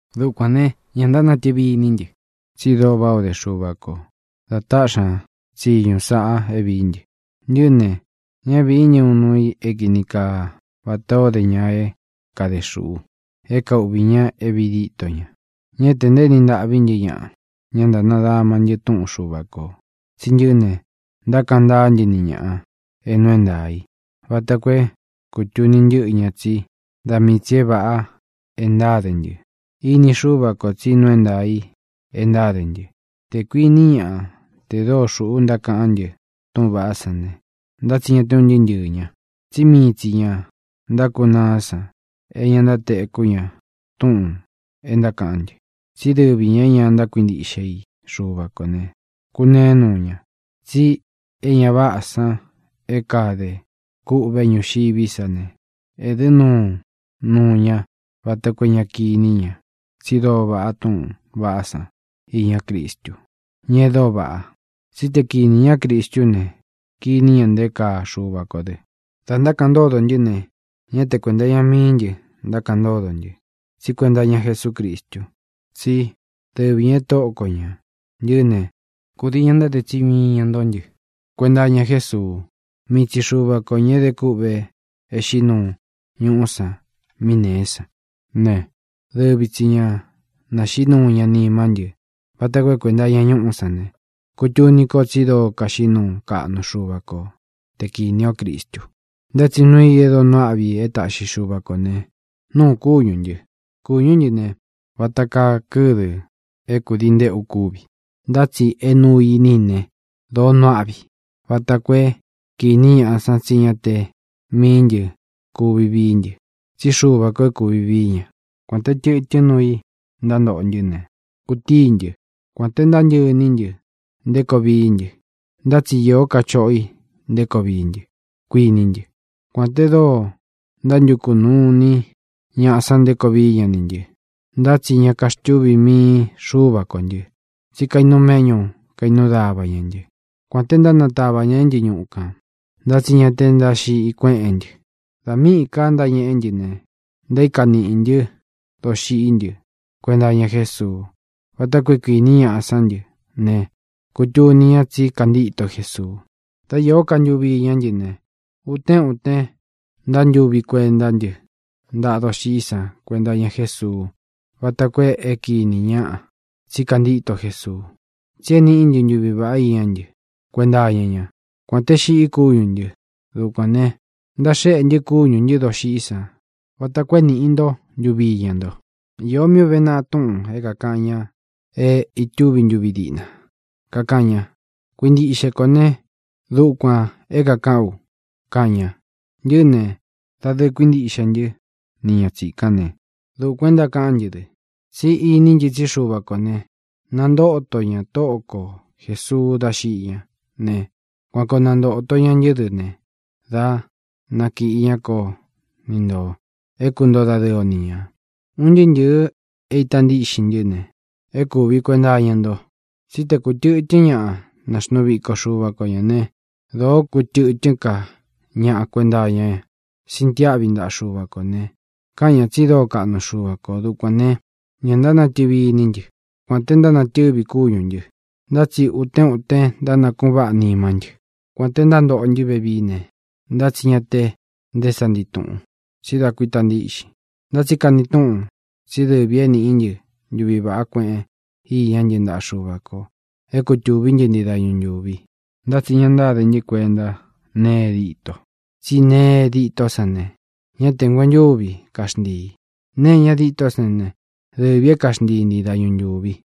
Dukuān ne, ña ntánatɨvi iní ntɨ, tsi dóo váꞌā o dé Xuva kō da táꞌxi ña tsiñu sāꞌa é vīí ntɨ. Ntɨꞌɨ́ ne, ñá vīí ntɨ uun nuu i é kini kaa vatā ó de ña é kade xūꞌu, é kauꞌvī ña é vīi ditó ña. Ñá tē ntaéni ntaꞌví ntɨ ñaꞌa; ña ntánadama ntɨ túꞌun Xuva kō. Tsi ntɨꞌɨ́ ne, ntákaꞌan ntáa ntɨ́ ni ñāꞌa é nuu é ntaā í vata koo é kūtuni ntɨ́ꞌɨ ña tsí da mii tsī é vāꞌa e ntáde ntɨ. Ini Xúva kō tsí nuu é ntaā i e ntáde ntɨ. Tē kuiní ñaꞌa te dóo xūꞌu ntákaꞌán ntɨ túꞌūn vaꞌá san ne, ntá tsi ña te un ntɨɨ́ ntɨɨ̄ ña, tsí mii tsī ña ntákunaá san é ña ntátekú ña túꞌūn e ntákaꞌán ntɨ. Tsí dɨvi ñā é ña ntákuintíꞌxe i Xuva kō ne, kūneé nuu ña. Tsi é ña váꞌā san é kadē kûꞌvé ñuxiví sa ne, ēdɨ́ nuu nuu ña vata koo é ña kiní ña tsi dóo vaꞌá túꞌūn vaꞌá san iñá Cristu, ña e dóo vaꞌa. Tsí te kīni ñá Cristú ne, kiní ña nté kaa Xuva kō dɨ. Dā ntákaꞌan ntódo ntɨ́ ne, ñá te kuēnta iña mií ntɨ ntákaꞌan ntódo ntɨ, tsí kuenta iña Jesúcristu, tsí dɨvi ñā e Tóꞌo ko ñā. Ntɨꞌɨ́ ne, kūdii ña ntáde tsiñu iña nto ntɨ́ kuenta iña Jésuu. Mii tsi Xuva kō, ña é de kûꞌve é xiꞌí nuu ñuꞌú san mí nēé san ne, dɨvi tsi ñā naxiꞌí nuu ña nimá ntɨ vata koo é kuenta iña ñúꞌu san ne, kutuni ko tsi dóo kaxiꞌí nuu kaꞌnu Xuva ko te kinī ó Cristu. Ntá tsi nuu i e dóo nuu aꞌvi e táꞌxi Xuva kō ne, nuu kúñū ntɨ. Kūñú ntɨ ne, vata kaa kɨ́dɨ̄ é kudii ntéꞌu kúvi, ntá tsi é nuu iní i ne, dōo nuu áꞌvi i vata koo é kīni ñáꞌa tsí ña te míī ntɨ́ kuvi vií ntɨ, tsí Xuva kō é kūvi vií ña. Kuān te tɨtɨ́n nuu i ntántoꞌo ntɨ́ ne, kūtíi ntɨ. Kuān té ntántɨꞌɨ iní ntɨ nté koo vií ntɨ, ntá tsi īó ka choꞌo i nté koo vií ntɨ, kuiní ntɨ. Kuān te dóo ntántukū nuu iní ñaꞌa san nté koo vií ña nī ntɨ, ntá tsi ña kaxtuví mii Xuva kó ntɨ, tsí kainuu méꞌñu kainuu dáva ña ntɨ. Kuān te ntánantāva ña ntɨ ñúꞌu kān, ntá tsi ña te ntáxiꞌi kueꞌén ntɨ. Dā míꞌī ka ntáñeꞌé ntɨ ne, ntaíka niꞌī ntɨ́ doxiꞌí ntɨ kuenta iña Jésuu váta koo é kīní ñaꞌa sán ntɨ ne, kutuni ña tsí kantíto Jesuu. Dá īó ka ntuvi iñá ntɨ ne, utén utén ntántuvi kuentá ntɨ ntaꞌa doxiꞌí san kuenta iña Jésuu váta koo é kīní ñaꞌa tsí kantíto Jesuu, tsi é nīꞌí ntɨ ntuvi vāꞌá iñá ntɨ kuenta iña ñá, kuān te xiꞌí kúñū ntɨ. Dukuān ne, ntaxéꞌe ntɨ kúñū ntɨ dóxiꞌí san vata koo é nīꞌi nto ntuvi íña nto. Īó mí ūve naꞌa túꞌūn é kākaꞌan ña é itúvi ntuvi díꞌna, kakaꞌan ña: “Kuīntiꞌxe kó ne, dukuān é kākaꞌán u”, kaꞌan ña. Ntɨꞌɨ́ ne, dadɨɨ kuíntiꞌxe ntɨ́ ni ña tsīkán ne, dukuān e ntákaꞌán ntɨ dɨ. Tsí iní ntɨ tsí Xuva kō ne, nantóto ña Tóꞌo ko Jēsuu dá xiꞌi ñá ne, kuan koo nantōto ña ntɨ́ dɨ ne, dá nakīꞌi ña kó ni ntō, é kuntoo dadɨɨ o ni ñā. Un ntɨɨ́ ntɨ̄ɨ é ita ntíꞌxin ntɨ́ ne, e kúvi kuenta iña nto. Tsí tē kútɨ̄tɨ́n ñaꞌa naxnuu viko Xuva ko ñā né, dōo kútɨ̄tɨ́n ka ñaꞌa nakuéꞌe ña sintiáꞌvi ntaꞌa Xuva kō ne, kaꞌan ñá tsi dóo kaꞌnu Xuva kō. Dukuān ne, ña ntánatɨvi iní ntɨ. Kuān té ntánatɨvi kúñū ntɨ, ntá tsi utén utén ntánakuꞌun váꞌa nimá ntɨ. Kuān té ntántoꞌo ntɨ́ vevií ne, ntá tsi ñá tē nté sa ntii tūꞌun, tsí da kuíta ntiꞌxin. Ntá tsi kani túꞌun tsí dɨvī é nīꞌí ntɨ ntuvi vāꞌá kueꞌen iñá ntɨ ntaꞌa Xuva kō é kutūví ntii dañu ntūvi. Ntá tsi ña ntáde ntɨ́ kuenta nee e dîto, tsí nee e dîtó san ne, ña te nguentúvi kaxntīi; nee é ña dîtó san ne, dɨvī é kaxntii ntii dañu ntūvi.